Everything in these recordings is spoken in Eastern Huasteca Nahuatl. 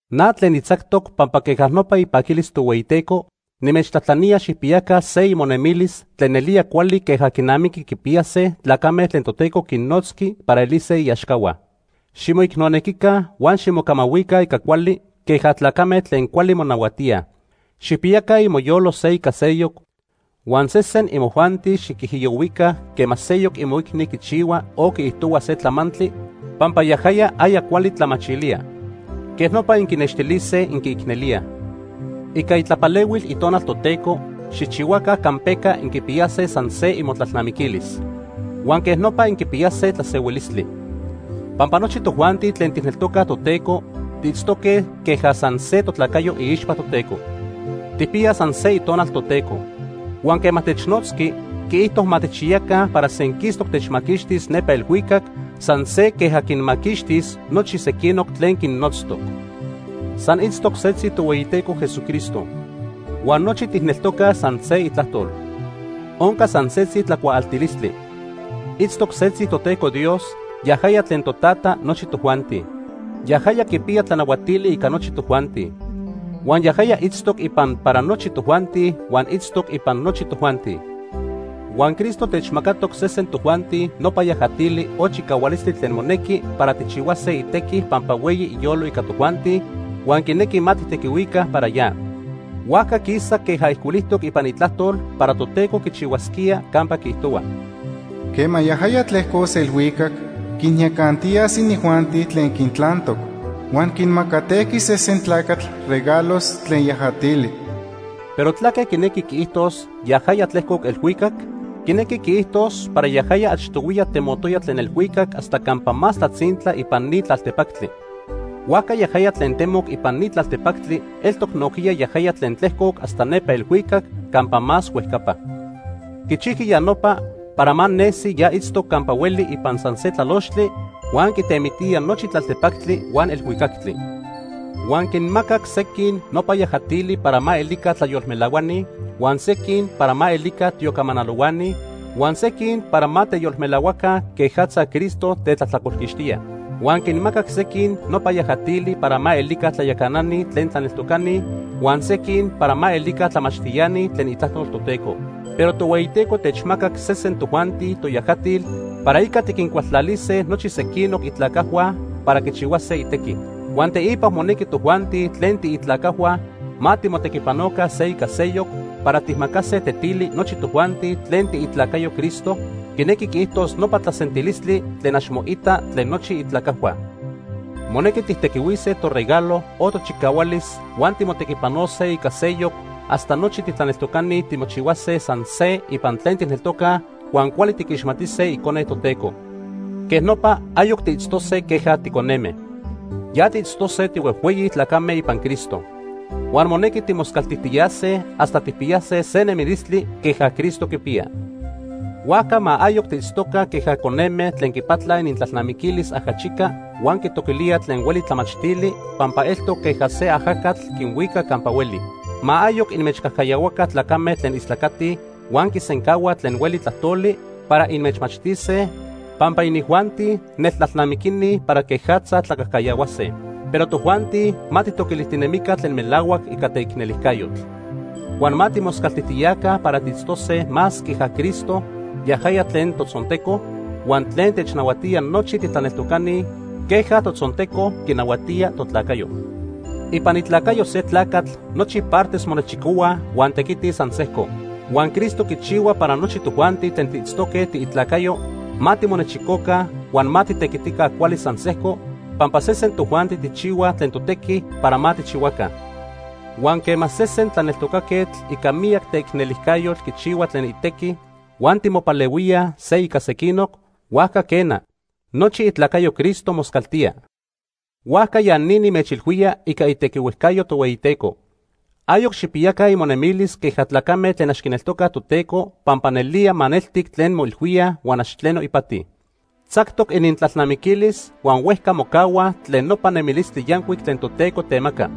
Na tlen nitzactoc pampa queja nopa ipaquilis Tohueyiteco, nimechtlajtlanía xijpiyaca se imonemilis tlen nelía cuali queja quinamiqui quipiyase tlacame tlen Toteco quinnotzqui para elise iaxcahua. Ximoicnonequica huan ximocamahuica ica cuali queja tlacame tlen cuali monahuatíaj. Xijpiyaca imoyolo se ica seyoc, huan sesen imojuanti xiquijiyohuica quema seyoc imoicni quichihua o quiijtohua se tlamantli pampa yajaya aya cuali tlamachilía. Quej nopa inquinextilise inquiicnelíaj. Ica itlapalehuil Itonal Toteco, xijchihuaca campeca inquipiyase san se imotlalnamiquilis. Huan quej nopa inquipiyase tlasehuilistli. Pampa nochi tojuanti tlen tijneltocaj Toteco tiitztoque queja san se totlacayo iixpa Toteco. Tijpiyaj san se Itonal Toteco. Huan quema technotzqui, quiijto ma tijchiyaca para senquistoc techmaquixtis nepa elhuicac san se queja quinmaquixtis nochi sequinoc tlen quinnotztoc. San itztoc setzi Tohueyiteco Jesucristo. Huan nochi tijneltocaj san se Itlajtol. Onca san setzi tlacuaaltilistli. Itztoc setzi Toteco Dios, yajaya tlen Totata nochi tojuanti. Yajaya quipiya tlanahuatili ica nochi tojuanti. Huan yajaya itztoc ipan para nochi tojuanti huan itztoc ipan nochi tojuanti. Huan Cristo techmacatoc sesen tojuanti nopa yajatili o chicahualistli tlen monequi para tijchihuase itequi pampa hueyi iyolo ica tojuanti huan quinequi ma tijtequihuica para ya. Huajca quisa queja ijcuilijtoc ipan Itlajtol para Toteco quichihuasquía campa quiijtohua: “Quema yajaya tlejcos elhuicac quinyacantiyas inijuanti tlen quintlantoc. Huan quinmacatejqui sesen tlacatl regalos tlen yajatili.” Pero ¿tlaque quinequi quiijtos “yajaya tlejcoc elhuicac”? Quinequi quiijtos para yajaya achtohuiya temotoya tlen elhuicac hasta campa más tlatzintla ipan ni tlaltepactli. Huajca yajaya tlen temoc ipan ni tlaltepactli eltoc nojquiya yajaya tlen tlejcoc hasta nepa elhuicac campa más huejcapa. Quichijqui ya nopa para ma nesi ya itztoc campa hueli ipan san se tlalochtli huan quitemitía nochi tlaltepactli huan elhuicactli. Huan quinmacac sequin nopa yajatili para ma elica tlayolmelahuani, huan sequin para ma elica tiocamanalohuani, huan sequin para ma teyolmelahuaca quejatza Cristo tetlajtlacolquixtía. Huan quinmacac sequin nopa yajatili para ma elica tlayacanani tlen tlaneltocani huan sequin para ma elica tlamachtiani tlen Itlajtol Toteco. Pero Tohueyiteco techmacac sesen tojuanti toyajatil para ica tiquincualtlalise nochi sequinoc itlacajhua para quichihuase itequi. Huan teipa monequi tojuanti tlen tiitlacajhua ma timotequipanoca se ica seyoc para tijmacase tetili nochi tojuanti tlen tiitlacayoj Cristo, quinequi quiijtos nopa tlasentilistli tlen ax moita tlen nochi itlacajhua. Monequi tijtequihuise toregalo o tochicahualis huan timotequipanose ica seyoc hasta nochi titlaneltocani timochihuase san se ipan tlen tijneltocaj huan cuali tiquixmatise Icone Toteco. Quej nopa ayoc tiitztose queja ticoneme. Ya tiitztose tihuejhueyi tlacame ipan Cristo. Huan monequi timoscaltijtiyase hasta tijpiyase se nemilistli queja Cristo quipiya. Huajca ma ayoc tiitztoca queja coneme tlen quipatlaj inintlalnamiquilis ajachica huan quitoquilíaj tlen hueli tlamachtili pampa eltoc queja se ajacatl quinhuica campa hueli. Ma ayoc inmechcajcayahuaca tlacame tlen istlacatij huan quisencahuaj tlen hueli tlajtoli para inmechmachtise, pampa inijuanti neltlalnamiquini para quejatza tlacajcayahuase. Pero tojuanti ma tijtoquilijtinemica tlen melahuac ica teicnelijcayotl. Huan ma timoscaltijtiyaca para tiitztose más queja Cristo, yajaya tlen totzonteco, huan tlen technahuatía nochi titlaneltocani queja totzonteco quinahuatía totlacayo. Ipan itlacayo se tlacatl nochi partes monechicohuaj huan tequitij san sejco. Huan Cristo quichihua para nochi tojuanti tlen tiitztoque tiitlacayoj ma timonechicoca huan ma titequitica cuali san sejco pampa sesen tojuanti tijchihuaj tlen totequi para ma tijchihuaca. Huan quema sesen tlaneltocaquetl ica miyac teicnelijcayotl quichihua tlen itequi huan timopalehuíaj se ica sequinoc, huajca quena, nochi itlacayo Cristo moscaltía. Huajca ya ni nimechilhuía ica itequihuejcayo Tohueyiteco. Ayoc xijpiyaca imonemilis queja tlacame tlen ax quineltocaj Toteco pampa nelía maneltic tlen moilhuíaj huan ax tleno ipati. Tzactoc inintlalnamiquilis huan huejca mocahuaj tlen nopa nemilistli yancuic tlen Toteco temaca.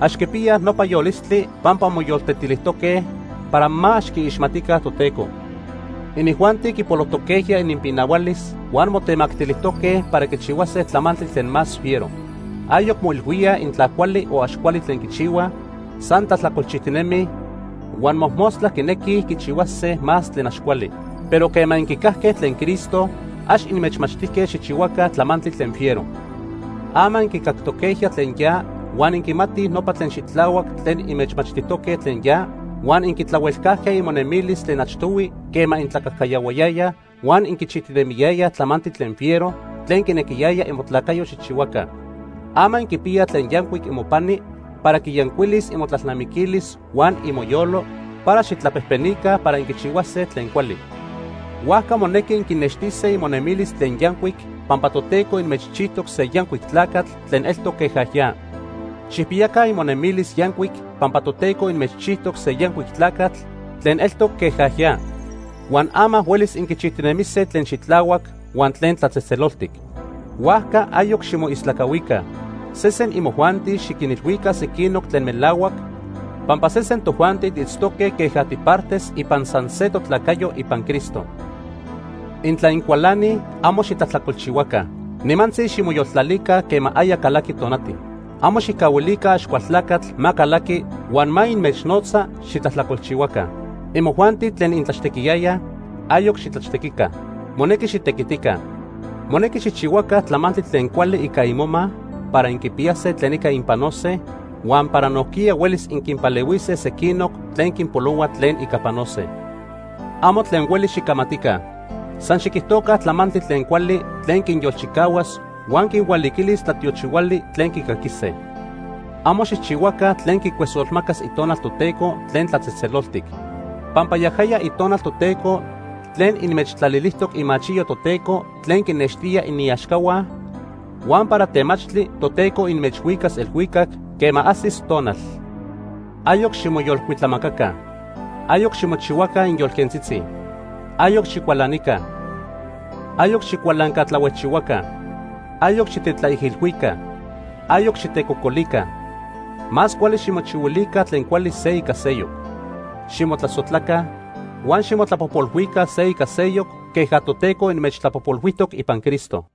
Ax quipiyaj nopa yolistli pampa moyoltetilijtoque para ax quiixmatica Toteco. Inijuanti quipolojtoquejya ininpinahualis huan motemactilijtoque para quichihuase tlamantli tlen más fiero. Ayoc moilhuíaj intla cuali o ax cuali tlen quichihuaj, san tlajtlacolchijtinemij, huan mojmostla quinequij quichihuase más tlen ax cuali. Pero quema inquicajque tlen Cristo, ax inmechmachtijque xijchihuaca tlamantli tlen fiero. Ama inquicactoquejya tlen ya huan inquimatij nopa tlen xitlahuac tlen inmechmachtijtoque tlen ya, huan inquitlahuelcajque imonemilis tlen achtohui quema intlacajcayahuayayaj huan inquichijtinemiyayaj tlamantli tlen fiero tlen quinequiyaya imotlacayo xijchihuaca. Ama inquipiyaj tlen yancuic imopani para quiyancuilis imotlalnamiquilis huan imoyolo para xijtlapejpenica para inquichihuase tlen cuali. Huajca monequi inquinextise imonemilis tlen yancuic pampa Toteco inmechchijtoc se yancuic tlacatl tlen eltoc queja ya. Xijpiyaca imonemilis yancuic pampa Toteco inmechchijtoc se yancuic tlacatl tlen eltoc queja ya. Huan ama huelis inquichijtinemise tlen xitlahuac huan tlen tlatzejtzeloltic. Huajca ayoc ximoistlacahuica. Sesen imojuanti xiquinilhuica sequinoc tlen melahuac pampa sesen tojuanti tiitztoque queja tipartes ipan san se totlacayo ipan Cristo. Intla incualanij, amo xitlajtlacolchihuaca. Nimantzi ximoyoltlalica quema aya calaqui tonati. Amo xijcahuilica Axcualtlacatl ma calaqui huan ma inmechnotza xitlajtlacolchihuaca. Imojuanti tlen intlaxtequiyayaj, ayoc xitlaxtequica. Monequi xitequitica. Monequi xijchihuaca tlamantli tlen cuali ica imoma para inquipiyase tlen ica inpanose huan para nojquiya huelis inquinpalehuise sequinoc tlen quinpolohua tlen ica panose. Amo tlen hueli xicamatica. San xiquijtoca tlamantli tlen cuali tlen quinyolchicahuas huan quinhualiquilis tlatiochihuali tlen quicaquise. Amo xijchihuaca tlen quicuesolmacas Itonal Toteco tlen tlatzejtzeloltic. Pampa yajaya Itonal Toteco tlen inmechtlalilijtoc imachiyo Toteco tlen quinextía iniaxcahua huan para temachtli Toteco inmechhuicas elhuicac quema ajsis tonal. Ayoc ximoyolcuitlamacaca. Ayoc ximochihuaca inyolquentzitzi. Ayoc xicualanica. Ayoc xicualancatlahuejchihuaca. Ayoc xitetlaijilhuica. Ayoc xitecocolica. Más cuali ximochihuilica tlen cuali se ica seyoc. Ximotlasojtlaca huan ximotlapojpolhuica se ica seyoc queja Toteco inmechtlapojpolhuijtoc ipan Cristo.